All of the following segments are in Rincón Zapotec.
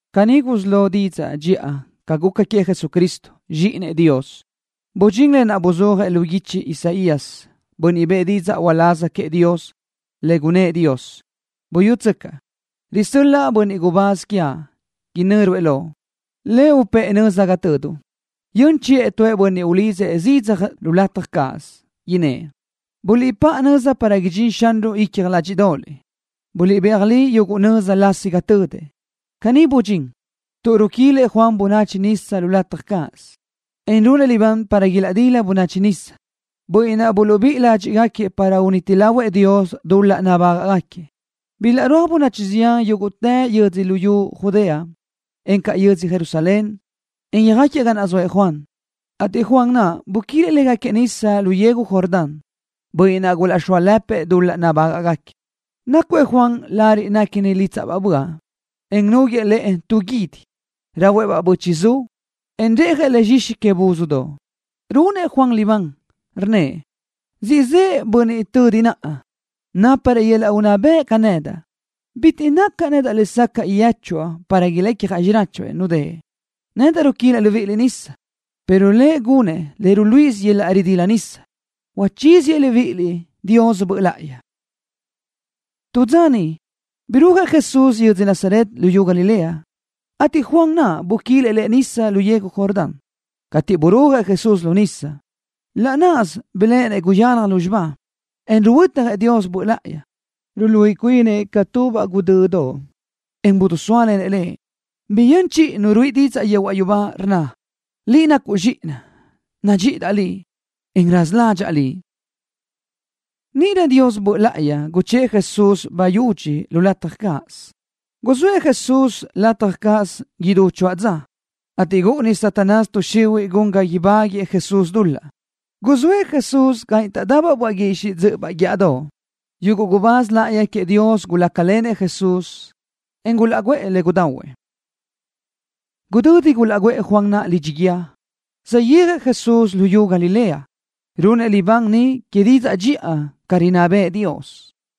Caní gusí lo didzaʼ dxiʼa ca guca queëʼ Jesucristo, Zxíʼinëʼ Dios. Budxín lë naʼ buzúajëʼ lu guichi Isaías, bönniʼ bëʼë didzaʼ uláz queëʼ Dios, le gunnë́ʼ Dios: Buyútsöcaʼ, risö́l-laʼa bönniʼ gubáz quiaʼ, inö́ruëʼ Loʼ. Lëʼ upë́ʼë nöza ga töduʼ. Yön chiʼë tu bönniʼ ulidzëʼ zidzaj lu lataj cáʼasö, innë́ʼ: “Buliʼpáʼa nöza para idxín Xanruʼ yichaj lázxdoʼoliʼ. Buliʼbéaj li yuguʼ nöza lasi ga tödëʼ.” Caní budxín, tuʼ ruquilëʼ Juan bönachi nisa lu lataj cáʼasö, en runëʼ libán para ilaʼdila bönachi nisa, bönniʼ naʼ buluʼbíʼi ládxiʼgaquiëʼ para uniti lahuëʼ Dios dul-laʼ nabágaʼgaquiëʼ. Bilaʼrúaj bönachi zián yúguʼtë yödzö luyú Judea, encaʼ yödzö Jerusalén, en yöjáquiëʼ ga naʼ zoëʼ Juan, ateʼ Juan naʼ buquilëʼ légaquiëʼ nisa lu yegu Jordán, bönniʼ naʼ gulaʼxóalëpëʼ dul-laʼ nabágaʼgaquiëʼ. Nácuëʼ Juan lariʼ néquini lítsaʼbaʼ böaʼ, en núguëʼë lëʼë tu guídi. Rahuëʼ-baʼ bö́chiʼzu, en reʼjëʼ le zxixi que buzdoʼ. Runëʼ Juan libán, rnnëʼ: —Siʼ zëʼë bönniʼ tödi naʼa, náparëʼ yöl-laʼ unná bëʼ ca nedaʼ. Bitiʼ nacaʼ nedaʼ lesacaʼ yéchuaʼ, para ilecjaʼ xiráchuëʼ nudë́ʼë. Nedaʼ ruquilaʼ libíʼiliʼ nisa, pero Lëʼ gunëʼ le ruluíʼisö yöl-laʼ ridila nisa ni, uchíziëʼ libíʼiliʼ Dios Böʼ Láʼayi. Tu dza niʼ birúajëʼ Jesús yödzö Nazaret luyú Galilea, ateʼ Juan naʼ buquilëʼ Lëʼ nisa lu yegu Jordán. Cateʼ burúajëʼ Jesús lu nisa, laʼ náʼasö biléʼenëʼ guyalaj lúzxiba, en ruhuötjëʼ Dios Böʼ Láʼayi, ruluíʼi cuinëʼ ca tubaʼ guʼdödoʼ, en bidisóalenëʼ Lëʼ. Biyö́n chiʼi nu ruíʼi didzaʼ yehuaʼ yubá, rnna: —Liʼ nacuʼ Zxíʼinaʼ. Nadxíʼidaʼ Liʼ, en raza ládxaʼa Liʼ. Níʼirö Dios Böʼ Láʼayi guchë́ʼë Jesús bayudxi lu lataj cáʼasö. Guzóëʼ Jesús lataj cáʼasö naʼ idú choáʼ dza, ateʼ gúʼuni Satanás tuʼ xihuiʼ gun ga ibáguëʼë Jesús dul-laʼ. Guzóëʼ Jesús ga niʼ taʼdabaʼ böaʼ guixiʼ dzö́ʼöbaʼ guíʼadoʼ. Yuguʼ gubáz láʼayi queëʼ Dios gulácalenëʼ Jesús, en gulaʼguʼë le gudahuëʼ. Gudödi gulaʼguʼë Juan naʼ lidxi guíë, saʼyéajëʼ Jesús luyú Galilea. Runëʼ libán niʼ que didzaʼ dxiʼa ca rinná bëʼë Dios.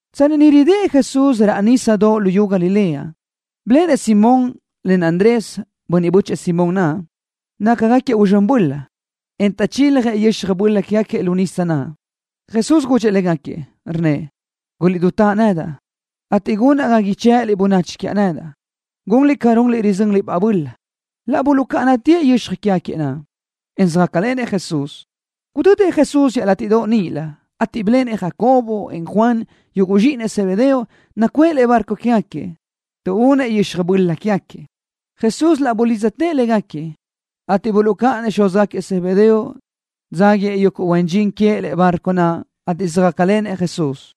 Tsanni niʼ ridë́ʼ Jesús raʼ nísadoʼ luyú Galilea, biléʼenëʼ Simón len Andrés, bönniʼ bö́chëʼë Simón naʼ. Nácagaquiëʼ uzxö́n böla, en taʼchiljëʼ yöxaj böla quégaquiëʼ lu nisa naʼ. Jesús gudxëʼ légaquiëʼ, rnnëʼ: —Guliʼdutáʼ nedaʼ, ateʼ gunaʼ ga ichë́ʼëliʼ bönachi quiaʼ nedaʼ, gunliʼ ca runliʼ rizönliʼ-baʼ böla. Laʼ buluʼcáʼanatëʼ yöxaj quégaquiëʼ, en söjácalenëʼ Jesús. Gudödëʼ Jesús iaʼlátiʼdoʼ níʼilö, ateʼ biléʼenëʼ Jacobo, en Juan, yuguʼ zxíʼinëʼ Zebedeo, nacuʼë lëʼe bárcodoʼ quégaquiëʼ, tuʼúnëʼ yöxaj böla quégaquiëʼ. Jesús laʼ bulidztëʼ légaquiëʼ, ateʼ buluʼcáʼanëʼ xúzgaquiëʼ Zebedeo, dzáguiëʼ yuguʼ huen dxin queëʼ lëʼe bárcodoʼ naʼ, ateʼ söjácalenëʼ Jesús.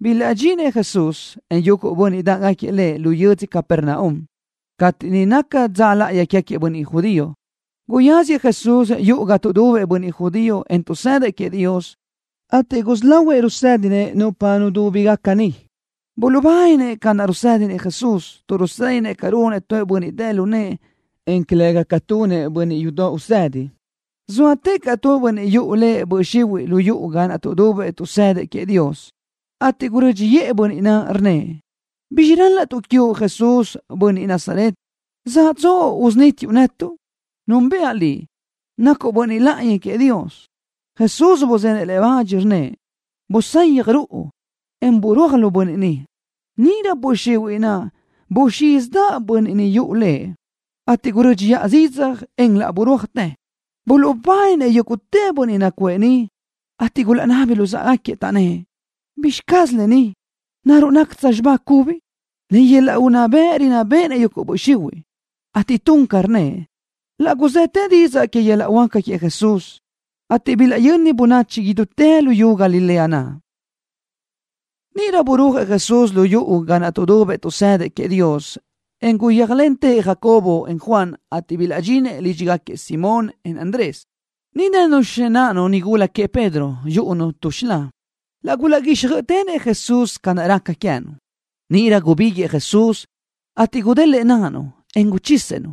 Bilaʼdxinëʼ Jesús, en yuguʼ bönniʼ dáʼgaquiëʼ Lëʼ lu yödzö Capernaum. Cateʼ niʼ naca dza láʼayi quégaquiëʼ bönniʼ judío, guyáziëʼ Jesús yuʼu ga tuʼdubëʼ bönniʼ judío, en tuʼsëdëʼ queëʼ Dios, ateʼ gusí lahuëʼ rusédinëʼ nupa nudúbigaca niʼ. Buluʼbáninëʼ ca naʼ rusédinëʼ Jesús, tuʼ rusédinëʼ ca runëʼ tu bönniʼ dë lu nëʼë, en calëga ca tunëʼ bönniʼ yudoʼ usëdi. Zóatëʼ caʼ tu bönniʼ yuʼu lëʼ böʼ xihuiʼ lu yuʼu ga naʼ tuʼdubëʼ tuʼsëdëʼ queëʼ Dios, ateʼ gurö́dxiʼë bönniʼ naʼ, rnnëʼ: —¿Bizxi rál-laʼtuʼ quiuʼ, Jesús, bönniʼ Nazaret? ¿Zaʼtsuʼ usunítiuʼ netuʼ? Núnbëʼa Liʼ, nacuʼ Bönniʼ Láʼayi queëʼ Dios. Jesús buzenëʼ le bach, rnnëʼ: —Busayaj ruʼu, en burúaj lu bönniʼ ni. Níʼirö böʼ xihuiʼ naʼ buxízidaʼ bönniʼ naʼ yuʼu lëʼ, ateʼ gurö́dxiʼa zidzaj, en laʼ burúajtë. Buluʼbáninëʼ yúguʼtë bönniʼ nacuʼë niʼ, ateʼ gulaʼnabi luzë́ʼegaquiëʼ, taʼnnë́ʼ: —¿Bizxi caz lë ni? ¿Naruʼ nácatsö xibá cubi? ¡Len yöl-laʼ unná bëʼ rinná béʼenëʼ yuguʼ böʼ xihuiʼ, ateʼ tun ca rnnëʼ! Laʼ guzëtë didzaʼ que yöl-laʼ huáca queëʼ Jesús, ateʼ bilaʼyöni bönachi idútë luyú Galilea naʼ. Níʼirö burúajëʼ Jesús lu yuʼu ga naʼ tuʼdubëʼ tuʼsëdëʼ queëʼ Dios, en laʼ guyéajlentëʼ Jacobo, en Juan, ateʼ bilaʼdxinëʼ lídxigaquiëʼ Simón, en Andrés. Niʼ dënu xináʼanu nigula queëʼ Pedro, yúʼunu tu xilá. Laʼ gulaʼguíxjöiʼitenëʼ Jesús ca raca queë́nu. Níʼirö gubíguiʼë Jesús, ateʼ gudélëʼë náʼanu, en guchisëʼ-nu.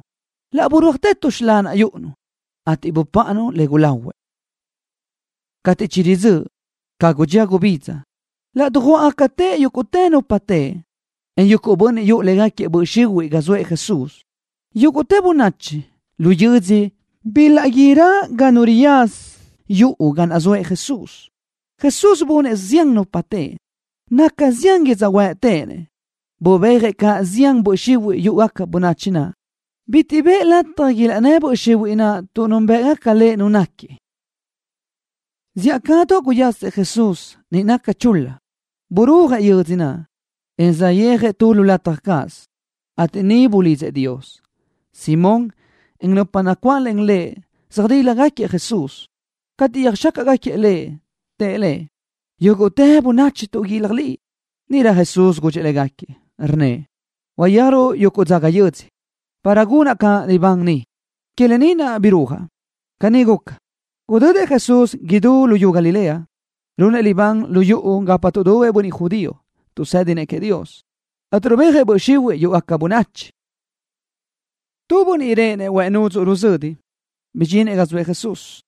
Laʼ burúajtë tu xilá naʼ yúʼunu, ateʼ bupáʼanu le gulahuëʼ. Cateʼ chiridzö́ʼ, ca gudxía gubidza, laʼ dujuáʼgacatëʼ yúguʼtë nupa teʼe, en yuguʼ bönniʼ yuʼu légaquiëʼ böʼ xihuiʼ ga zoëʼ Jesús. Yúguʼtë bönachi lu yödzö bilaʼguírö ga nu riyaza yuʼu ga naʼ zoëʼ Jesús. Jesús bunëʼ zián nupa teʼe, naca zián yödzöhuë́ʼ téʼenëʼ. Bubéajëʼ caʼ zián böʼ xihuiʼ yúʼugaca bönachi naʼ. Bitiʼ bëʼë lataj ilaʼnnë́ böʼ xihuiʼ naʼ tuʼ núnbëʼgaca Lëʼ Nu náquiëʼ. Zíʼacadoʼ guyasëʼ Jesús, niʼ naca chul-la. Burúajëʼ yödzö naʼ, en saʼyéajëʼ tu lataj cáʼasö, ateʼ niʼ bulidzëʼ Dios. Simón, en nupa nacuáʼlen lëʼ söjdíljagaquiëʼ Jesús. Cateʼ yöjxácaʼgaquiëʼ Lëʼ, tëʼ Lëʼ: —Yúguʼtë bönachi tuʼguílaj Liʼ. Níʼirö Jesús gudxëʼ légaquiëʼ, rnnëʼ: —Uyéajruʼ yuguʼ dzaga yödzö, para gunaʼ caʼ libán niʼ. Que lë ni naʼ birúajaʼ. Caní guca, gudödëʼ Jesús idú luyú Galilea, runëʼ libán lu yuʼu gapa tuʼdubëʼ bönniʼ judío, tuʼsë́dinëʼ queëʼ Dios, ateʼ rubéajëʼ böʼ xihuiʼ yúʼugaca bönachi. Tu bönniʼ réʼenëʼ huëʼ nudzuʼ ruzödi bidxinëʼ ga zoëʼ Jesús.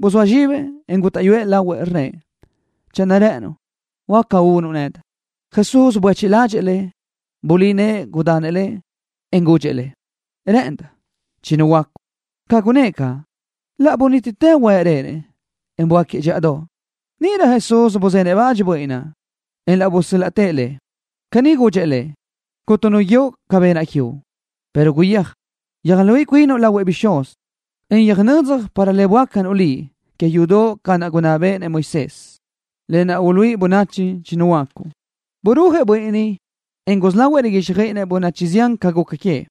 Buzóa zxibëʼ, en gútaʼyuëʼ lahuëʼ, rnnëʼ: —Channö rë́ʼënuʼ, huáca unuʼ nedaʼ. Jesús buéchiʼ ládxëʼë lëʼ. Bulí nëʼë, gudanëʼ lëʼ, en gudxëʼ lëʼ: —Rë́ʼëndaʼ. Chinuhuöácuʼ. Ca gunnë́ʼ caʼ, laʼ bunítitë huëʼ réʼenëʼ, en böáquiëʼ dxíʼadoʼ. Níʼirö Jesús buzenëʼ bach bönniʼ naʼ, en laʼ busö́l-laʼtëʼ lëʼ. Caní gudxëʼ lëʼ: —Cuntu nu guíoʼ ca benaʼ quiuʼ, pero guyéaj, yöjluíʼi cuinuʼ lahuëʼ bixúz, en yöjnödzaj para le böácanuʼ liʼ que yudoʼ ca naʼ gunná bëʼë Moisés, lë naʼ uluíʼi bönachi chinuhuöácuʼ. Burúajëʼ bönniʼ ni, en gusí lahuëʼ riguíxjöiʼinëʼ bönachi zián ca guca queëʼ.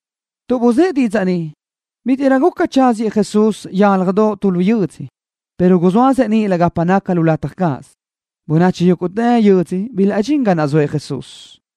Tuʼ buzë́ʼ didzaʼ ni, bítiʼrö guca tsáziëʼ Jesús yálajdoʼ tu lu yödzö, pero guzóasëʼ níʼilö gapa naca lu lataj cáʼasö. Bönachi yúguʼtë yödzö bilaʼdxín ga naʼ zoëʼ Jesús.